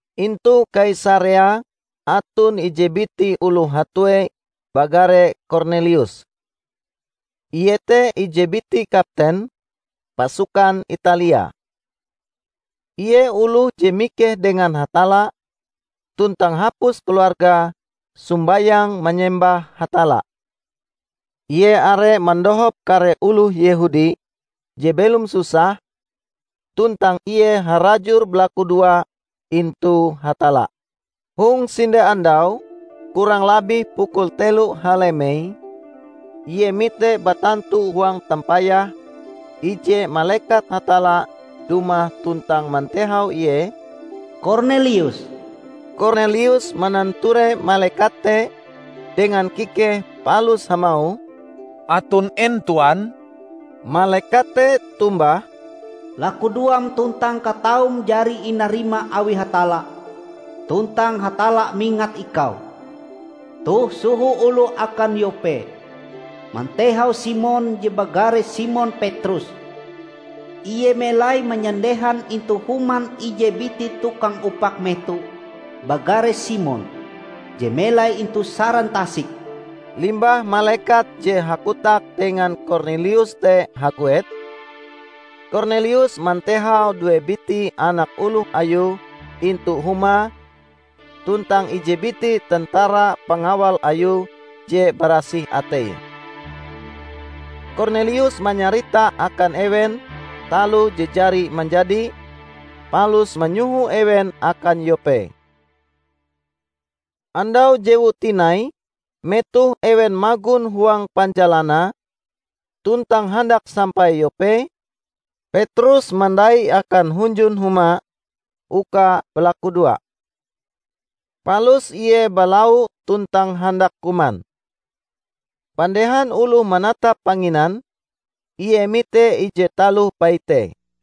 Intu Kaisarea aton ije biti oloh hatue bagare Kornelius. Ie te ije biti kapten "Pasukan Italia". Ie oloh je mikeh dengan Hatalla tuntang hapus keluargae sombayang manyembah Hatalla. Ie are mandohop kare oloh Yehudi je belom susah, tuntang ie harajur balakudoa intu Hatalla. Hong sinde andau kurang labih pukul telo halemei ie mite batantu huang tampayahe, ije malekat Hatalla dumah tuntang mantehau ie, "Kornelius!" Kornelius mananture malekat te dengan kikehe palus hamauh, "Aton en Tuan?" Malekat te tombah, "Lakudoam tuntang kataum jari inarima awi Hatalla tuntang Hatalla mingat ikau. Toh soho oloh akan Yope mantehau Simon je bagare Simon Petrus. Ie melai manyandehan intu human ije biti tukang upak meto bagare Simon, je melai intu saran tasik." Limbah malekat je hakotak dengan Kornelius te haguet, Kornelius mantehau due biti anak oloh ayue intu humae tuntang ije biti tentara pangawal ayue je barasih ateie. Kornelius manyarita akan ewen taloh je jari manjadi, palus manyoho ewen akan Yope. Andau jewue tinai metoh ewen magon huang panjalanae tuntang handak sampai Yope, Petrus mandai akan hunjun huma uka balakudoa. Palus ie balau tuntang handak kuman. Pandehan oloh manatap panginan, ie mite ije taloh paite.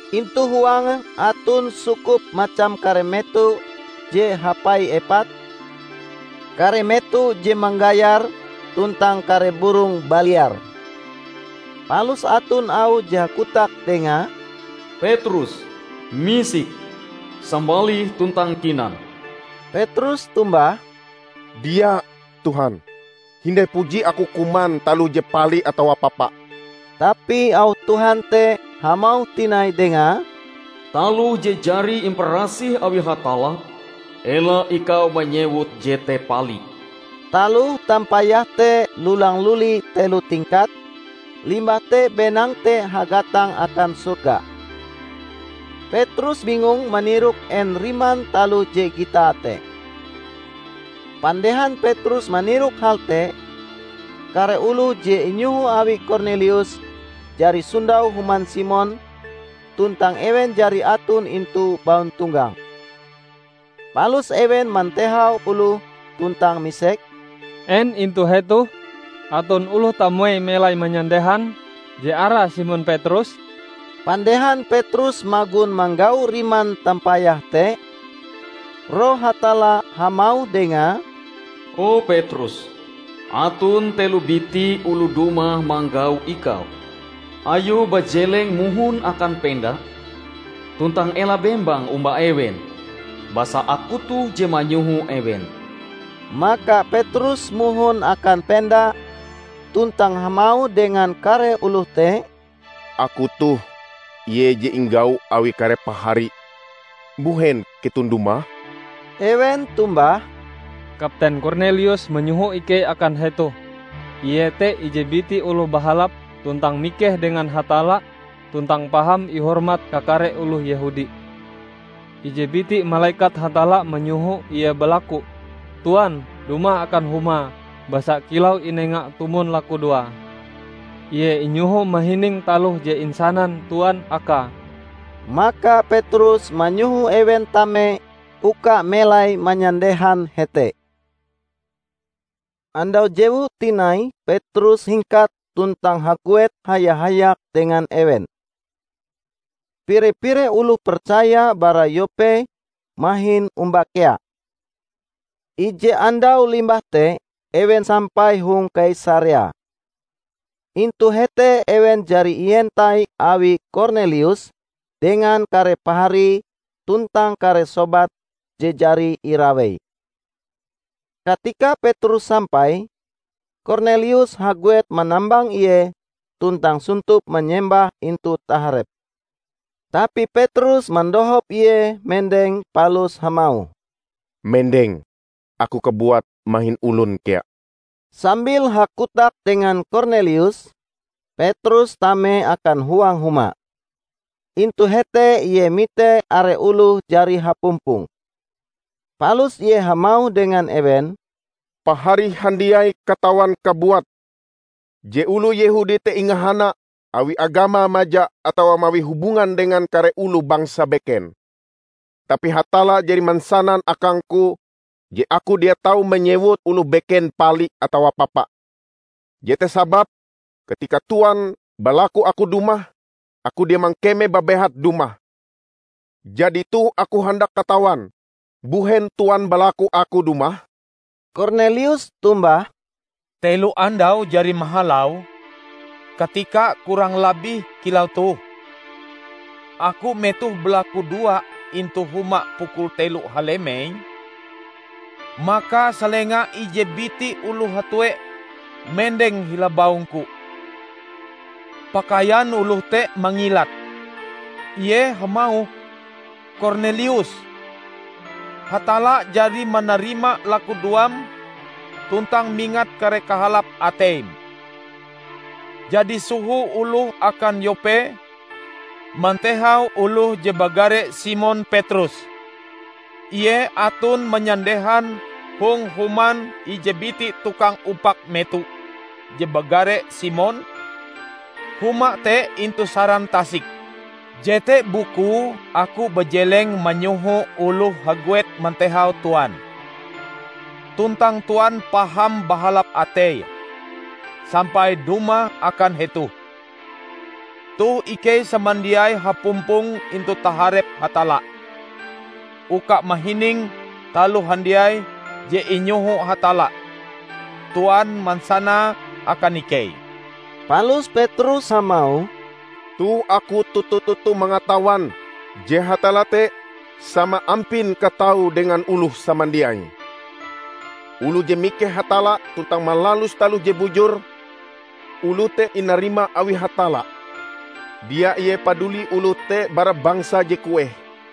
Intu huange aton sukup macam kare meto je hapai epat, kare meto je manggayar tuntang kare burong baliar. Palus aton auh je hakotak dengae, "Petrus, misik! Sambalih tuntang kinan!" Petrus tombah, "Dia, Tuhan! Hindai puji aku kuman taloh je pali atawa papa." Tapi auh Tuhan te hamauh tinai dengae, "Taloh je jari imparasih awi Hatalla, ela ikau manyewut jete pali." Taloh tampayahe te lulang-luli telo tingkat, limbah te benang te hagatang akan sorga. Petrus bingung manirok en riman taloh je gitae te. Pandehan Petrus manirok hal te, kare oloh je inyoho awi Kornelius jari sondau human Simon tuntang ewen jari aton intu bauntonggang. Palus ewen mantehau oloh tuntang misek, "En intu hetoh aton oloh tamuei melai manyandehan je arae Simon Petrus?" Pandehan Petrus magon manggau riman tampayahe te, Roh Hatalla hamauh dengae, "O Petrus, aton telo biti oloh dumah manggau ikau. Ayo bajeleng mohon akan penda tuntang ela bembang omba ewen, basa Aku toh je manyoho ewen." Maka Petrus mohon akan penda tuntang hamauh dengan kare oloh te, "Aku toh ie je inggau awi kare pahari. Mbuhen keton dumah?" Ewen tombah, "Kapten Kornelius manyoho ikei akan hetoh. Ie te ije biti oloh bahalap tuntang mikeh dengan Hatalla tuntang paham ihormat kakare oloh Yehudi. Ije biti malekat Hatalla manyoho ie balaku Tuan dumah akan humae basa kilau inenga tumon lakudoae, ie inyoho mahining taloh je insanan Tuan akae." Maka Petrus manyoho ewen tame uka melai manyandehan hete. Andau jewue tinai Petrus hingkat tuntang haguet haya-hayak dengan ewen. Pire-pire oloh percaya bara Yope mahin omba kea. Ije andau limbah te ewen sampai hong Kaisarea. Intu hete ewen jari ientai awi Kornelius dengan kare paharie tuntang kare sobate je jari iraweie. Katika Petrus sampai, Kornelius haguet manambang ie tuntang sontop manyembah intu taharepe. Tapi Petrus mandohop ie mendeng palus hamauh, "Mendeng! Aku kabuat mahin olon kea." Sambil hakotak dengan Kornelius, Petrus tame akan huang huma. Intu hete ie mite are oloh jari hapumpong. Palus ie hamauh dengan ewen, "Pahari handiai katawan kabuat je oloh Yehudi te ingahana awi agamae maja atawa mawi hubungan dengan kare oloh bangsa beken. Tapi Hatalla jari mansanan akangku je aku dia tau manyewut oloh beken pali atawa papa. Jete sababe katika Tuan balaku aku dumah, aku dia mangkeme babehat dumah. Jadi toh aku handak katawan mbuhen Tuan balaku aku dumah." Kornelius tombah, "Telo andau jari mahalau, katika kurang labih kilau toh, aku metoh balakudoa intu huma pukul telo halemei. Maka salenga ije biti oloh hatue mendeng hila baungku. Pakaian oloh te mangilat. Ie hamauh, 'Kornelius! Hatalla jari manarima lakudoam tuntang mingat kare kahalap ateim. Jadi soho oloh akan Yope mantehau oloh je bagare Simon Petrus. Ie aton manyandehan hong human ije biti tukang upak meto je bagare Simon; huma te intu saran tasik.' Jete bukue aku bajeleng manyoho oloh haguet mantehau Tuan. Tuntang Tuan paham bahalap atei sampai dumah akan hetoh. Toh ikei samandiai hapumpong intu taharep Hatalla uka mahining taloh handiai je inyoho Hatalla Tuan mansanae akan ikei." Palus Petrus hamauh, "Toh aku toto-toto mangatawan je Hatalla te sama ampin kataue dengan oloh samandiai. Oloh je mikeh Hatalla tuntang malalus taloh je bujur, oloh te inarima awi Hatalla, dia ie paduli oloh te bara bangsa je kueh.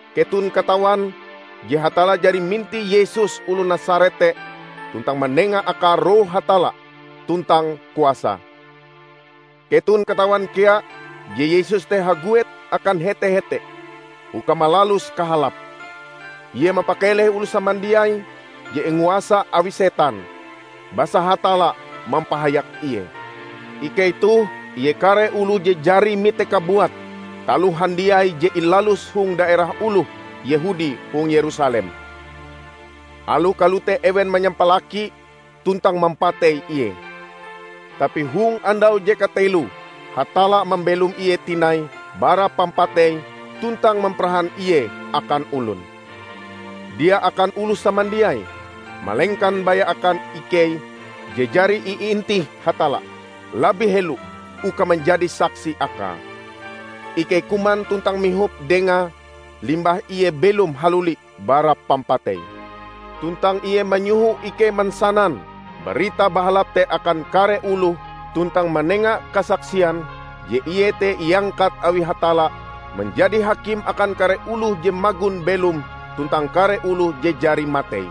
Keton katawan je Hatalla jari mintih Yesus oloh Nasaret te tuntang manenga Akae Roh Hatalla tuntang kuasa. Keton katawan kea je Yesus te haguet akan hete-hete uka malalus kahalap; Ie mampakeleh oloh samandiai je inguasa awi setan, basa Hatalla mampahayak Ie. Ikei toh ie kare oloh je jari mitee kabuat taloh handiai je ilaluse hong daerah oloh Yehudi hong Yerusalem. Aloh kalote ewen manyampalaki tuntang mampatei Ie. Tapi hong andau je kateloe Hatalla mambelom Ie tinai bara pampatei tuntang mamparahan Ie akan olon; dia akan oloh samandiai, malengkan baya akan ikei je jari iintih Hatalla labih helo uka manjadi saksi Akae: Ikei kuman tuntang mihop Dengae limbah Ie belom haluli bara pampatei. Tuntang Ie manyoho ikei mansanan Barita Bahalap te akan kare oloh tuntang manenga kasaksian je Ie te iangkat awi Hatalla manjadi Hakim akan kare oloh je magon belom tuntang kare oloh je jari matei.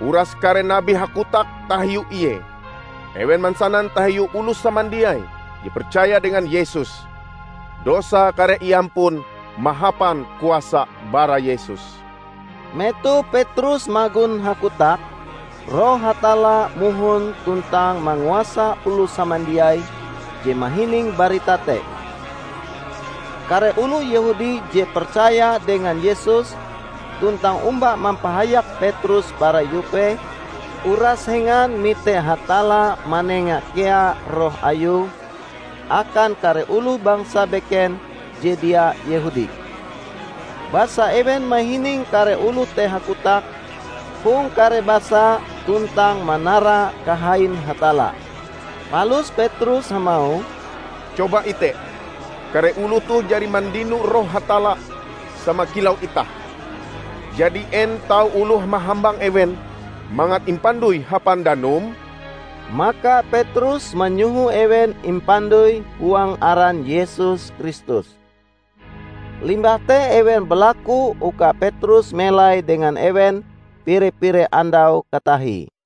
Uras kare nabi hakotak tahiu Ie. Ewen mansanan tahiu oloh samandiai je percaya dengan Yesus, dosae kareh iampun mahapan kuasa bara Yesus." Metoh Petrus magon hakotak, Roh Hatalla mohon tuntang manguasa oloh samandiai je mahining barita te. Kare oloh Yehudi je percaya dengan Yesus tuntang omba mampahayak Petrus bara Yope, uras hengan mite Hatalla manenga kea Roh Ayue akan kare oloh bangsa beken je dia Yehudi. Basa ewen mahining kare oloh te hakotak hong kare basa tuntang manara kahain Hatalla. Palus Petrus hamauh, "Coba ite, kare oloh toh jari mandino Roh Hatalla sama kilau itah. Jadi en tau oloh mahambang ewen mangat impandoi hapan danum?" Maka Petrus manyoho ewen impandoi huang aran Yesus Kristus. Limbah te ewen balaku uka Petrus melai dengan ewen pire-pire andau katahie.